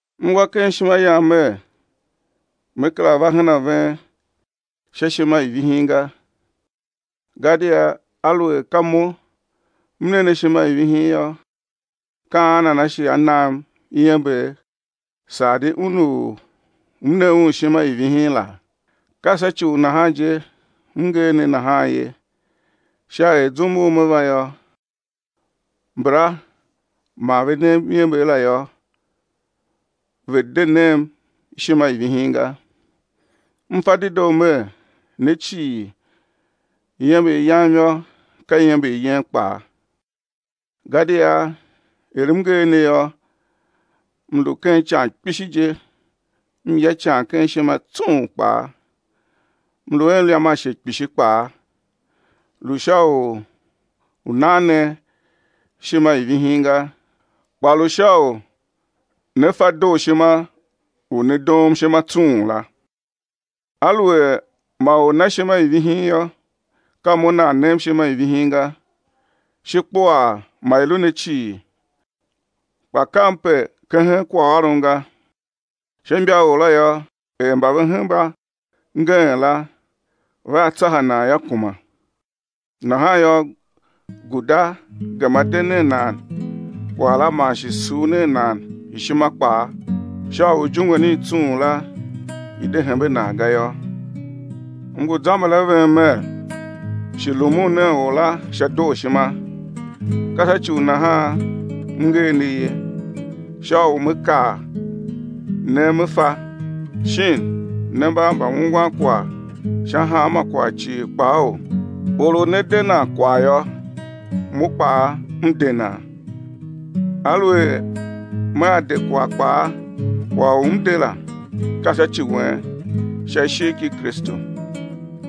M wa ken ishima yam mer me kera va hen a ven sha ishima i vihin ga. Gadia aluer ka mo m ne ne ishima i vihin yô, ka an nana shi á nam iember saa di un u m ne un ishima i vihin la? Ka sha ci u nahan je m nger ne nahan ye sha er zum u me va yô, mbala mba ma ve nem iember la yô, ve̱ de nem ishima i vihin ga. M fa dedoo mer, ne cii, iember yam yô, ka iember yen kpaa. Gadia er m nger ne yô, m lu ken ican kpishi, je m ya ican ken ishima tsung kpaa, mlu a mliam ashe kpishi kpaa lu sha u nan ne ishima i vihin ga, kpa lu sha u ne fa dooshima u ne doom ishima tsung la. Aluer ma or na ishima i vihin yô, ka mo nan nem ishima i vihin ga, shi kpuaa ma i lu ne cii, kpa kam pe kehen kwaghôron ga. Sha imbaor la yô, er mba ve hemba ngeen la vea tsaha nan yô, kuma. Nahan yô, guda gema de nen nan kwagh la man shi sur nen nan ishima kpaa sha u ijungwen i tsung la i̱ de hembe nan ga yô. M ngu zamber a ven mer, shi rumun nen or la sha dooshima. Ka sha ci u nahan m nger ne ye, sha u me kar ne me fa, shin ne mba mbaungwan kwagh sha hanma kwagh cii kpaou? Or u ne de nan kwagh yô, mo kpaa m de nan. Aluer mea de kwagh kpaa, kwagh u m de la, ka sha ci wen sha ishigh ki Kristu.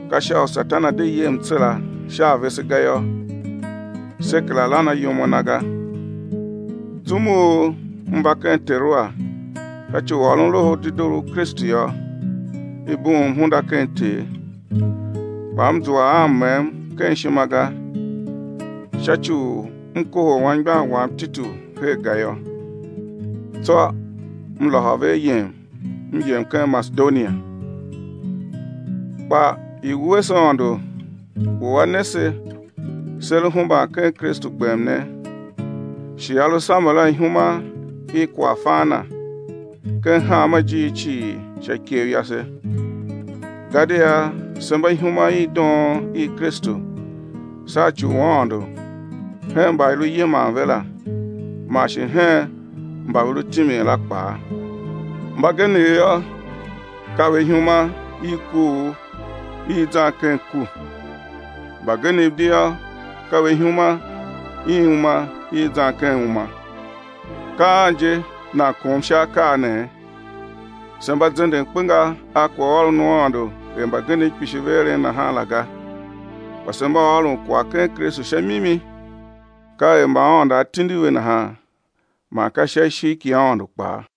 Ka sha u Satan a̱ de ye mtsera sha a vese ga yô. Se kera lan ayom a na ga. Zum u m va ken Teroa sha ci u ôron Loho u Dedoo u Kristu yô, i bughum hunda ken Ter kpa m zua a mmem ken ishima ga sha ci u m kohol anmgbian wam Titu her ga yô. Tsô m lôhô ve ayem m yem ken Masedonia. Kpa i̱ wuese Aôndo u A ne se, se lu hemban ken Kristu gbem ne, shi A lu samber a ihuma i kwaghfan Na ken hanma ijiir cii sha ikev yase. Gadia se mba ihuma i doon i Kristu sha ci u Aôndo hen mba i lu yiman ve la man shi hen mba ve lu timin la kpaa. Mbagenev yô, ka ve ihuma i kuugh i zan ken ku. Mbagenev di yô, ka ve ihuma i uma i zan ken uma. Ka an je nan kom sha akaa nee? Se mba zenden kpenga a kwaghôron u Aôndo er mbagenev kpishi ve eren nahan la ga, kpa se mba ôron kwagh ken Kristu sha mimi, ka er mba Aôndo A tindi ve nahan man ka sha ishigh ki Aôndo kpaa.